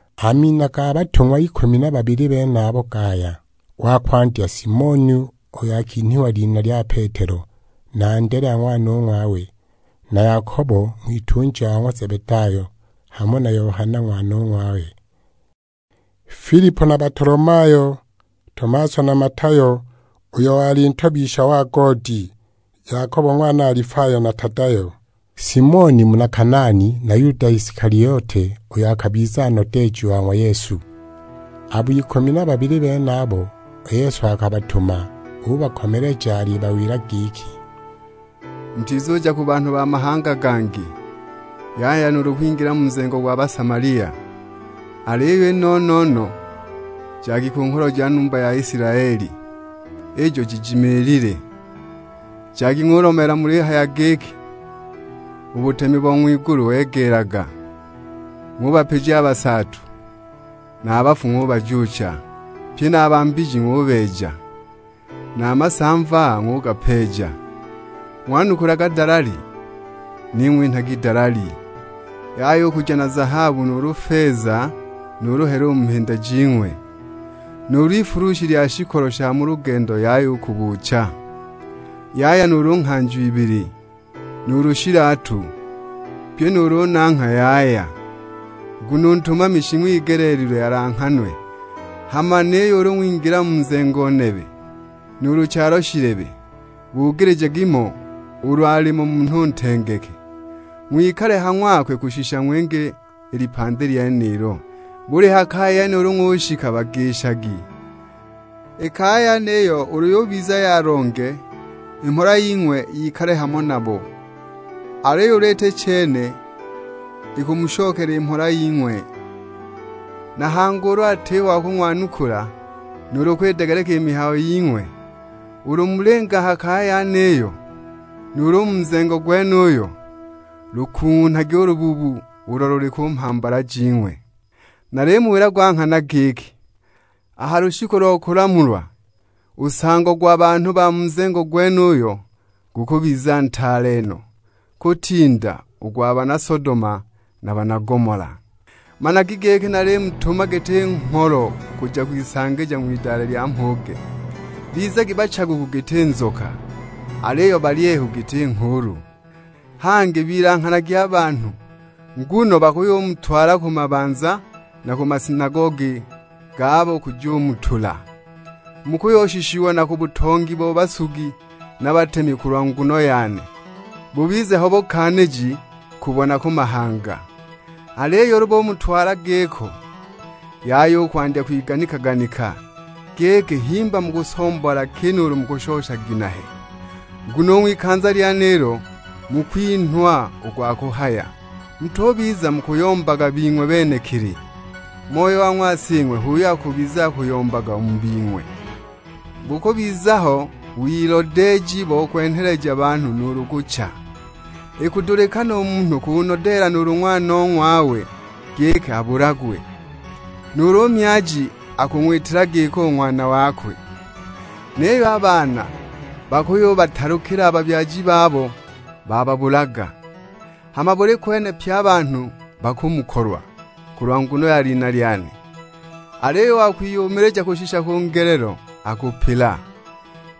A mina ga batung'wa ikumi na babili benabo gaya: wa kwandya Simoni, uyo akinhwa lina lya Petelo, na Andelea ng'wanong'wawe. Na Yakobo ng'witunja wa ng'wa Zebedayo, hamo na Yohana ng'wanong'wawe. Filipo na Batolomayo; Tomaso na Matayo, uyo wali ntobisha wa goodi. Yakobo ng'wana Alifayo na Tadayo; Simoni muna Kanaani, na Yuda Isikaliote, uyo akabiza nodeeji wa ng'wa Yesu. Abo ikumi na babili benaba, u Yesu akabatuma, ubakomeleja alibawila giki, "Mutizuja ku banhu ba mahanga gangi, yaya nuulu kwingila mu nzengo gwa Basamalia. Aliyo i no-no-no jagi ku ngholo ja numba ya Isilaeli, ijo jijimiilile! Jagi ng'ulomeela mulihaya giki, 'U butemi bo ng'wigulu wegeelaga.' Ng'ubapija a basaatu, na a bafu ng'ubajuucha, pye na a ba mbiji ng'ubeeja, na a masamva ng'ugapeeja. Ng'wanukulaga dalali, ning'we inhagi dalali. Yaya u kuja na zahabu nuulu feza, nuulu hela mu mhinda jing'we. Nuulu ifulushi lya shikolo sha mu lugendo yaya u kubuucha. Yaya nuulu nghanjo ibili, nuulu shilatu; pyi nuulu nangha yaya. Nguno u ntumami shing'wigeleelilwe alanghanwe. Hama niyo ulu ng'wingila mu nzengo nebe, nuulu chalo shilebe, bugilijagi mo ulu alimo munhu ntengeke, ng'wikale ha ng'wakwe kushisha ng'winge i lipandi lyenilo. Buli ha kaya yene ulu ng'ushika bagishagi. I kaya yeniyo ulu yubiza ya longe, i mhola ying'we yikale hamo nabo, aliyo ulu iti chene, ikumushokela i mhola ying'we! Na hangi ulu atiho wa kung'wanukula, nuulu kwidegeleka i mihayo ying'we, ulu mulinga a ha kaya yeniyo, nuulu u mu nzengo gwenuyo, lukung'unhagi nu lubuubu ulo luli ku mhambala jing'we. Nalimuwila gwa nghana giki, a ha lushiku lo kulamulwa, u nsango gwa banhu ba mu nzengo gwenuyo gukubiza ntaale no, kutinda u gwa bana Sodoma na bana Gomola." "Managi giki nalimutuma giti ngholo kuja kwisanja ng'widale lya mhuge; bizagi bachaguku giti nzoka, aliyo balyehu giti nghuulu. Hangi bilanghanagi a banhu, nguno bakuyumutwala ku mabanza na ku masinagogi gabo kujumutula. Mukuyushishiwa na ku butongi bo basugi na batemi kulwa nguno yane, bubize ho bukaaniji kubo na ku mahanga. Aliyo ulu bumutwala giko, yaya u kwandya kwiganika-ganika, giki himba mukusomboola ki nuulu mukushosha ginehe. Nguno u ng'wikanza lyenilo mukwinhwa u gwa kuhaya. Mutubiza mukuyombaga bing'we benekili, Moyo wa ng'wa Sing'we h'uyo akubiza akuyombaga u mu bing'we. "Bukubiza ho wilodeeji bo kwenheleja banhu nuulu kucha; ikudulikana u munhu kunodeela nuulu ng'wanong'wawe giki abulagwe. Nuulu u myaji akung'witila giko u ng'wana wakwe; niyo a baana bakuyubatalukila a babyaji babo bababulaga! Hama buli kwene pye a banhu bakumukolwa, kulwa nguno ya lina lyane. Aliyo u wa kwiyumilija kushisha ku ngelelo akupila.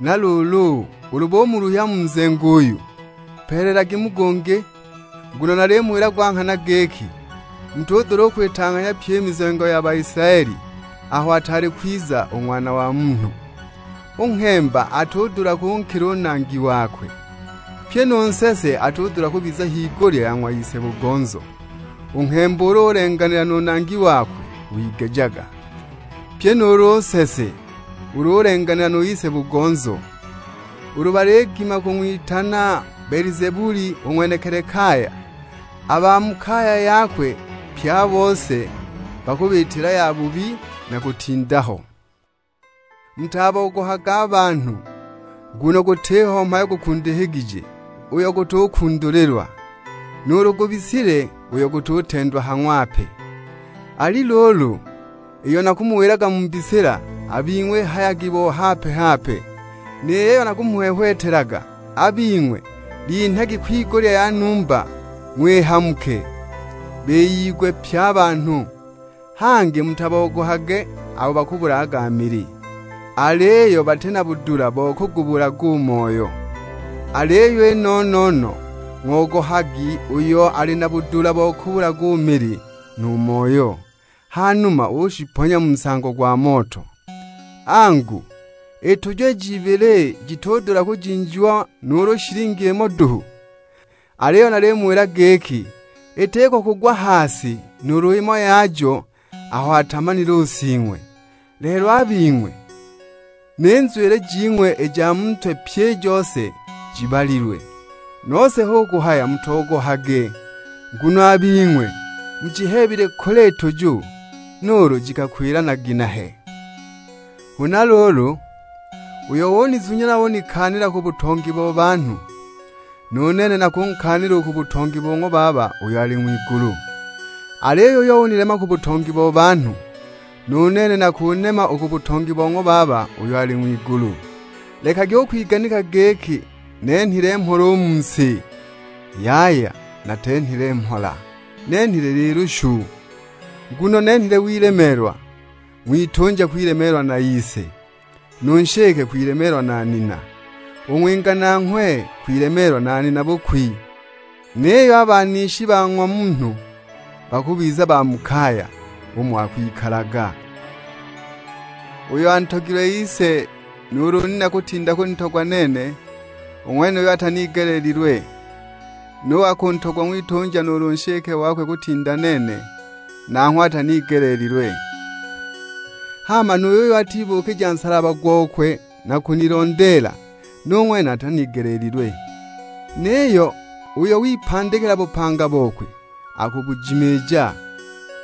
Na luulu ulu bumuluhya mu nzengo uyu, peelelagi mu gungi; nguno nalimuwila gwa nghana giki, mutudula u kwitang'anhya pyi i mizengo ya Baisilaeli aho ataali kwiza u Ng'wana wa Munhu! U nghemba atudula kunkila u nangi wakwe; pyi nu nsese atudula kubiza higulya ya ng'wa ise-bugonzo. U nghemba ulu ulenganila nu nangi wakwe wigejaga; pyi nuulu u nsese ulu ulenganila nu ise-bugonzo. Ulu baligima kung'witana Belizebuli u ng'wenekili kaya, a ba mu kaya yakwe pye a bose bakubiitila yabubi na kutinda ho!" "Mutabogohage a banhu, nguno gutiho mhayo gukundikigije, uyo gutukundulilwa; nuulu gwibisile, uyo gututendwa ha ng'wape. Ali luulu, iyo nakumuwilaga mu mbisila, a bing'we ihayagi bo hape-hape; ni yiyo nakumuhwehwetelaga, a bing'we linhagi kwigulya ya numba ng'wihamuke, biyigwe pye a banhu. Hangi mutabogohage abo bakabulagaga mili, aliyo bati na budula bo kugubulaga u moyo. Aliyo i no-no-no ng'ogohagi uyo ali na budula bo kugubulaga u mili nu moyo, ha numa ushiponya mu nsango gwa moto! Angu, i tuju ij'ibili, jitudula kujinjiwa nuulu shilingi imo duhu? Aliyo nalimuwila giki, itiko kugwa ha si nuulu imo yajo aho atamanile u Sing'we. Lelo a bing'we, ni nzwili jing'we i ja mu ntwe pyi i jose jibalilwe. Nose hu kuhaya mutogohage, nguno a bing'we mujiheebile kule i tuju, nuulu jikakwila na ginehe!" "Huna luulu, uyo unizunya na unikaanila ku butongi bo banhu, nu nene nakunkaanila u ku butongi bo ng'wa Baba uyo ali ng'wigulu. Aliyo uyo unilema ku butongi bo banhu, nu nene nakunema u ku butongi bo ng'wa Baba uyo ali ng'wigulu." "Lekagi u kwiganika giki nenhile mhola u mu si; yaya natenhile mhola, nenhile lilushu. Nguno nenhile wilemeelwa: ng'witunja kwilemeelwa na ise, nu nshike kwilemeelwa na nina, u ng'winga nanghwe kwilemeelwa na nina-bukwi. Niyo a banishi ba ng'wa munhu bakubiza ba mu kaya, umo akwikalaga. Uyo antogilwe ise nuulu nina kutinda kunitogwa nene, u ng'wenuyo atanigeleelilwe. Nu wa kuntogwa ng'witunja nuulu nshike wakwe kutinda nene, nanghwe atanigeleelilwe. Hama nu yuyo atibuukija nsalaba gokwe na kunilondeela, nu ng'wene atanigeleelilwe. Niyo uyo wipandikila bupanga bokwe, akubujimiija;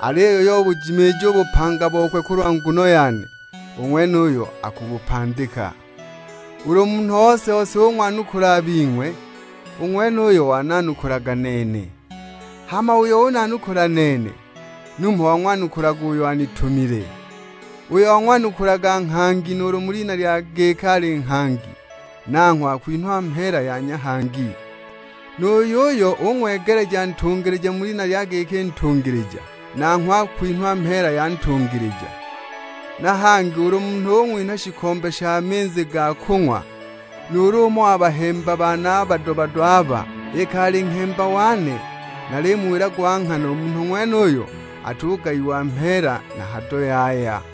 aliyo uyo ubujimiija u bupanga bokwe kulwa nguno yane, u ng'wenuyo akubupandika." "Ulu munhu ose-ose ung'wanukula a bing'we, u ng'wenuyo wananukulaga nene. Hama uyo unanukula nene, numho wang'wanukulaga uyo anitumile. Uyo ung'wanukula nghangi mu lina lya giki ali nghangi, nanghwe akwinhwa mheela ya nghangi. Nu yuyo ung'wegeleja ntungilija mu lina lya giki ntungilija, nanghwe akwinhwa mheela ya ntungilija. Na hangi ulu munhu ung'winha shikombe sha minzi ga kung'wa, nuulu umo wa bahemba bane a bado-bado aba, iki ali nghemba wane, nalimuwila gwa nghana u munhu ng'wenuyo atugayiwa mheela na hado yaya."